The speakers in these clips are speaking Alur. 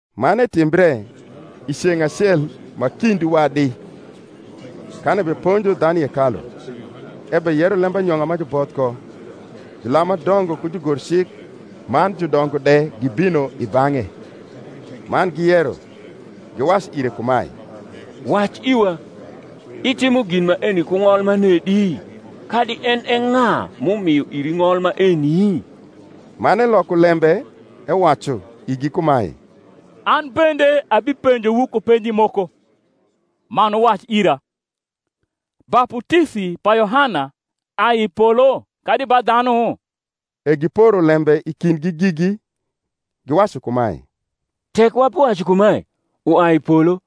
Man etimbre, i ceng’ acel ma kind wadi, kan ebeponjo dhanu i hekalu, ebeyero lembanyong’a ma juboth ko, julam ma dongo ku jugorcik man judongo de gibino i bang’e; man giyero, giwacu ire kumae, Wac iwa: Itimo gin maeni ku ng’ol manedi? Kadi en e ng’a m’umio iri ng’ol maeni? Man eloko lembe ewacu igi kumae, An bende abipenjowu ku penji moko; man wuwac ira: Baputisi pa Yohana, ai i polo kadi ba dhanu? E giporo lembe i kindgi gigi, giwacu kumae, Tek wabiwacu kumae, Uai i polo;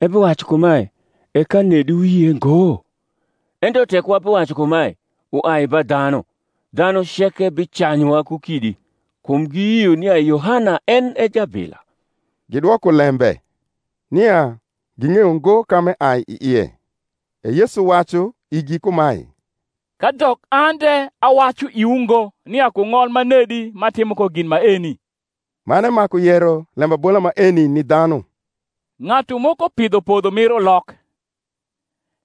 ebiwacu kumae, E ka nedi wuyie ngo? Ento tek wabiwacu kumae, Uai ba dhanu; dhanu ceke bicanyuwa ku kidi: kum giyio nia Yohana en e jabila. Gidwoko lembe, nia ging’eyo ngo ka m’eai i ie. E Yesu wacu igi kumae, Kadok an de awacu iwu ngo nia ku ng’ol manedi m’atimo ko gin maeni. Man emaku yero lembabola maeni ni dhanu: Ng’atu moko pidho podho mir ulok,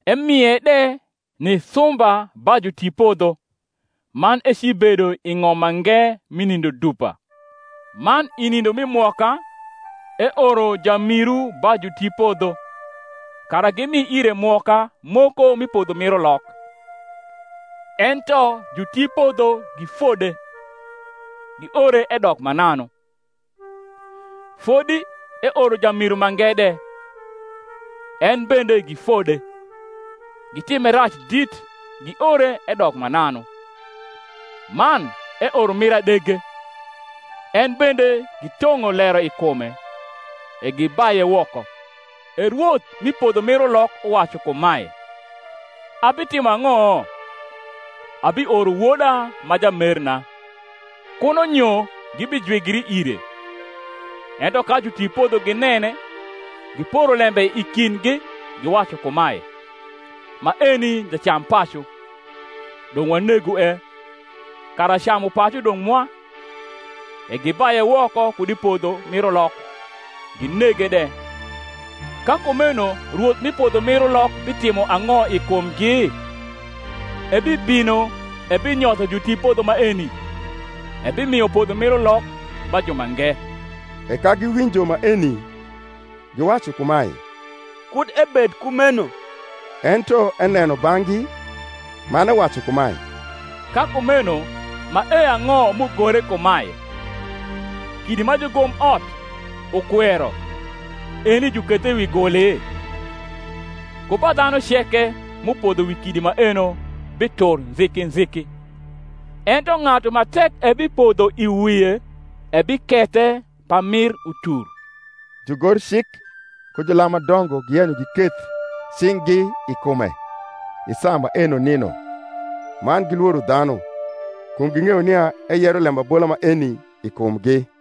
emie de ni sumba ba jutipodho, man ecibedo i ng’om mange mi nindo dupa. Man i nindo mi mwoka eoro jamiru ba jutipodho, kara gimi ire mwoka moko mi podho mir ulok: ento jutipodho gifode, giore edok mananu. Fodi eoro jamiru mange de: en bende gifode, gitime rac dit, giore edok mananu. Man eoro mir adege: en bende gitong’o lero i kume, e gibaye woko. E rwoth mi podho mir ulok uwacu kumae, Abitimo ang’o? Abioro woda ma jamerna; kuno nyo gibijwigri ire. Ento ka jutipodho ginene, giporo lembe i kindgi, giwacu kumae, Maeni jacampacu; dong’ wanegue, kara camupacu dong’ mwa. E gibaye woko kud i podho mir ulok, ginege de. Ka kumeno rwoth mi podho mir ulok bitimo ang’o i kumgi? Ebibino ebinyotho jutipodho maeni, ebimio podho mir ulok ba jumange. E ka giwinjo maeni, giwacu kumae, Kud ebed kumeno. Ento eneno bang’gi, man ewacu kumae, Ka kumeno mae ang’o m’ugore kumae, Kidi ma jugomot ukwero, Eni jukethe wi guli? Ku ba dhanu ceke m’upodho wi kidi maeno bitur nziki nziki; ento ng’atu ma tek ebipodlio i wie, ebikethe pamir utur. Jugorcik ku julam ma dongo giyenyo giketh cing’gi i kume i saa maeno nino; man gilworo dhanu: kum ging’eyo nia eyero lembabola maeni i kumgi.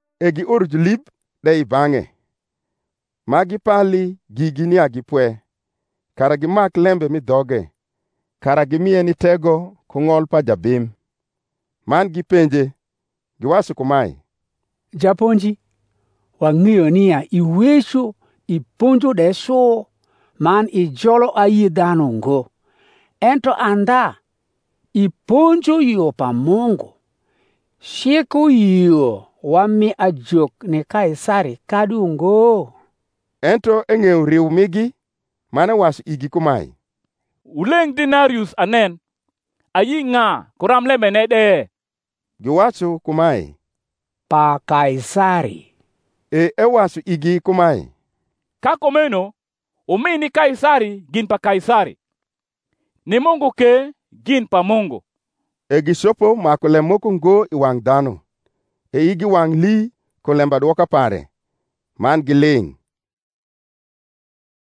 E gioro julib de i bang’e, ma gipali gigi nia gi pwe, kara gimak lembe m’i dhoge, kara gimie ni tego ku ng’ol pa jabim. Man gipenje, giwacu kumae, Japonji, wang’eyo nia iweco iponjo de cu, man ijolo ayi dhanu ngo, ento andha iponjo yo pa Mungu: Cik uyio wami ajok ni Kaisari, kadi ungo? Ento eng’eyo riu migi, man ewacu igi kumae, Wuleng’ denarius anen. Ayi ng’a ku ramblembene de? Giwacu kumae, Pa Kaisari. E ewacu igi kumae, Ka kumeno, wumi ni Kaisari gin pa Kaisari, ni Mungu ke gin pa Mungu. E gicopo maku lem moko ngo i wang’ dhanu: e igi wang’ lii kum lembadwoka pare, man giling’.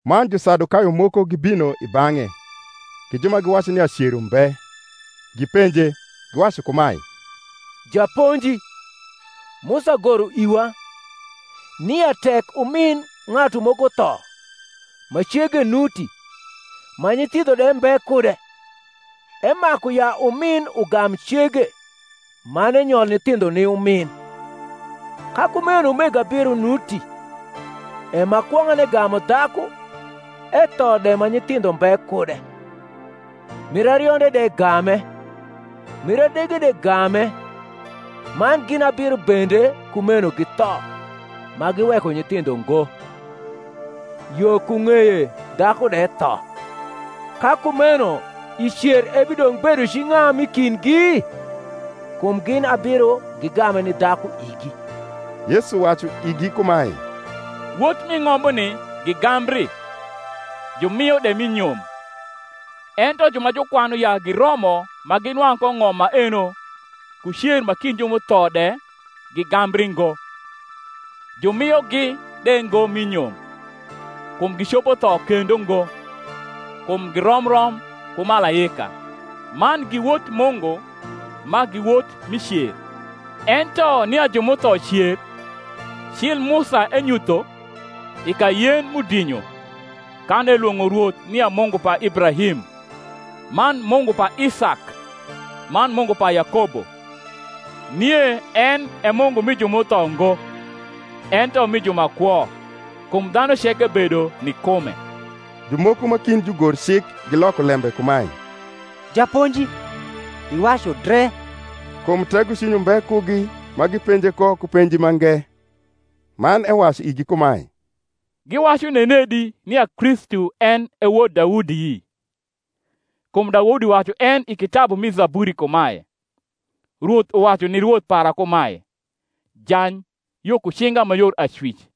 Man Jusadukayo moko gibino i bang’e, gi ju ma giwacu nia cer umbe: gipenje, giwacu kumae, Japonji, Musa goro iwa, nia tek umin ng’atu moko tho, ma cege nuti, ma nyithindho de mbe kude, emaku ya umin ugam cege, man enyol nyithindho ni umin. Ka kumeno umego abiro nuti: e ma kwong’ane gamu dhaku, etho de ma nyithindho mbe kude; mir arionde de game: mir adege de game; man gin abiro bende kumeno githo, ma giweko nyithindho ngo. Yo ku ng’eye dhaku de tho. Ka kumeno i cer ebidong’ bedo ci ng’a m’i kindgi? kum gin abiro gigame ni dhaku igi. Yesu wacu igi kumae, Wot m’i ng’ombuni gigambri, jumio de mi nyom: ento ju ma jukwanu ya giromo ma ginwang’ ko ng’om maeno, ku cer ma kind ju m’utho de, gigambri ngo, jumiogi de ngo mi nyom: kum gicopo tho kendo ngo: kum girom rom ku malaika; man gi wot Mungu, ma gi wot mi cer. Ento nia ju m’utho cer, cil Musa enyutho, i ka Yen m’udinyo, kan elwong’o Rwoth nia Mungu pa Ibrahim, man Mungu pa Isak, man Mungu pa Yakobo. Nie en e Mungu mi ju m’utho ngo, ento mi ju ma kwo: kum dhanu ceke bedo ni kume. Jumoko ma kind jugorcik giloko lembe kumae, Japonji, iwacu dre. Kum tegocwiny umbe kugi ma gipenje ko ku penji mange. Man ewacu igi kumae, Giwacu nenedi nia Kristu en e wod Daudi? Kum Daudi wacu en i kitabu mi Zaburi kumae, Rwoth uwacu ni Rwoth para kumae, Jany yo ku cinga ma yor acwic,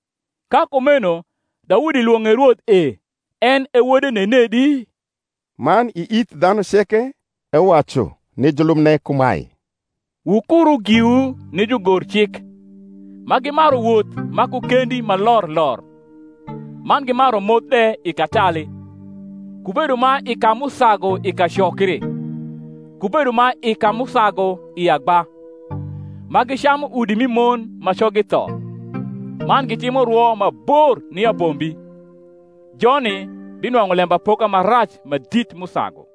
Ka kumeno Daudi lwong’e Rwoth e, en e wode nenedi? Man i ith dhanu ceke ewacu ni julubne kumae, Wukuru giwu ni jugorcik, ma gimaru woth ma ku kendi ma lor lor, man gimaru moth de i katali, ku bedo ma i ka m’usagu i kacokri, ku bedo ma i ka m’usagu i agba; ma gicamu udi mi mon ma coggi tho, man gitimo rwo ma bor ni abombi: joni binwang’u lembapoka ma rac ma dit m’usagu.